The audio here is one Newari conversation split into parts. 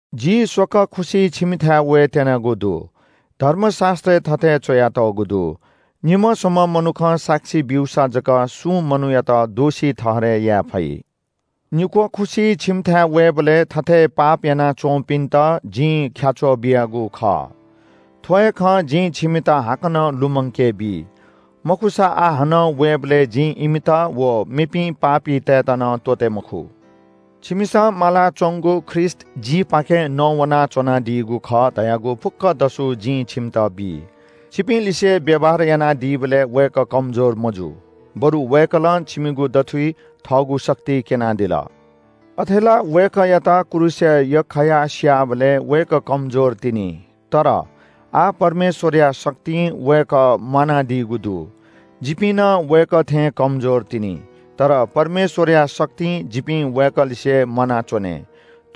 जि स्‍वकः खुसि छिमिथाय् वयेत्‍यनागु दु। धर्मशास्‍त्रय् थथे च्‍वयातःगु दु – “निम्‍ह, स्‍वम्‍ह मनुखं साक्षी ब्‍यूसा जक सुं मनूयात दोषी ठहरय् याये फइ।” निक्‍वः खुसि छिमिथाय् वयाबलय् थथे पाप यानाच्‍वंपिन्‍त जिं ख्‍याच्‍वः बियागु खः। थ्‍व हे खँ जिं छिमित हाकनं लुमंकेबी। मखुसा आः हानं वयेबलय् जिं इमित व मेपिं पापीतय्‌त नं त्‍वःते मखु। छिमिसं मालाच्‍वंगु ख्रीष्‍ट जिपाखें नवानाच्‍वनादीगु खः धयागु फुक्‍क दसु जिं छिमित बी। छिपिंलिसे व्‍यवहार यानादीबलय् वय्‌कः कमजोर मजू, बरु वय्‌कलं छिमिगु दथुइ थःगु शक्ति क्‍यनादिल। अथे ला वय्‌कःयात क्रूसय् यख्‍खायाः स्‍याःबलय् वय्‌कः कमजोर तिनि। तर आः परमेश्‍वरया शक्तिं वय्‌कः म्‍वानादीगु दु। जिपिं नं वय्‌कः थें कमजोर तिनि। तर परमेश्‍वरया शक्तिं जिपिं वय्‌कःलिसे म्‍वानाच्‍वने।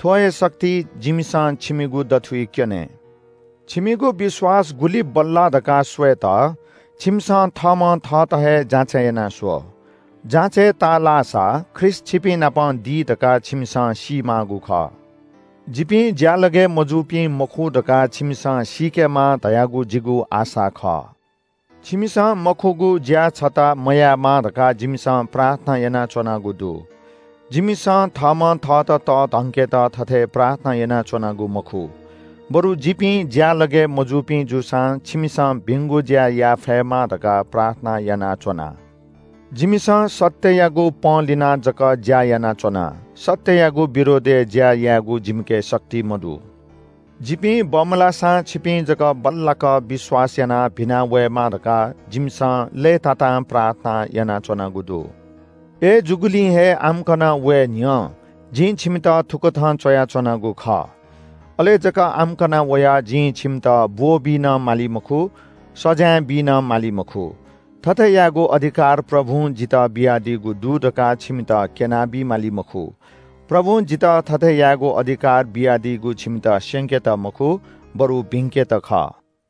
थ्‍व हे शक्ति जिमिसं छिमिगु दथुइ क्‍यने। छिमिगु विश्‍वास गुलि बल्‍लाः धकाः स्‍वयेत छिमिसं थःम्‍हं थःत हे जाँचय् यानाः स्‍व। जाँचय् ताःलाःसा ख्रीष्‍ट छिपिंनाप दी धकाः छिमिसं सीमाःगु खः। जिपिं ज्‍यालगय् मजूपिं मखु धकाः छिमिसं सीकेमा धयागु जिगु आशा खः। छिमिसं मखुगु ज्‍या छता मयायेमा धकाः जिमिसं प्रार्थना यानाच्‍वनागु दु। जिमिसं थःम्‍हं थःत तःधंकेत थथे प्रार्थना यानाच्‍वनागु मखु, बरु जिपिं ज्‍यालगय् मजूपिं जूसां छिमिसं भिंगु ज्‍या याये फयेमा धकाः प्रार्थना यानाच्‍वना। जिमिसं सत्‍ययागु पंलिनाः जक ज्‍या यानाच्‍वना, सत्‍ययागु विरोधय् ज्‍या यायेगु जिमिके शक्ति मदु। जिपिं बमलाःसां छिपिं जक बल्‍लाक विश्‍वास यानाः भिना वयेमा धकाः जिमिसं लय्‌तातां प्रार्थना यानाच्‍वनागु दु। अय्‌जूगुलिं हे आम्‍कन वये न्‍ह्यः जिं छिमित थुकथं च्‍वयाच्‍वनागु खः। अले जक आम्‍कन वयाः जिं छिमित ब्‍वःबी नं माली मखु, सजाँय बी नं माली मखु, थथे यायेगु अधिकार प्रभुं जितः बियादीगु दु धकाः छिमित क्‍यनाबी माली मखु। प्रभुं जितः थथे यायेगु अधिकार बियादीगु छिमित स्‍यंकेत मखु बरु भिंकेत खः।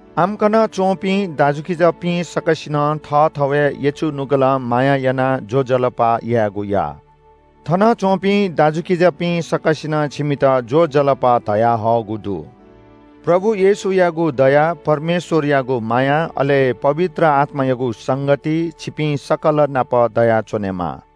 आम्‍कन च्‍वंपिं दाजुकिजापिं सकसिनं थःथवय् यचु नुगलं माया यानाः ज्‍वजलपा यायेगु या। थनच्‍वंपिं दाजुकिजापिं सकसिनं छिमित ज्‍वजलपा धयाहःगु दु। प्रभु येशू ख्रीष्‍टयागु दया, परमेश्‍वरयागु माया, अले पवित्र आत्‍मायागु संगति छिपिं सकल नाप दयाच्‍वनेमा।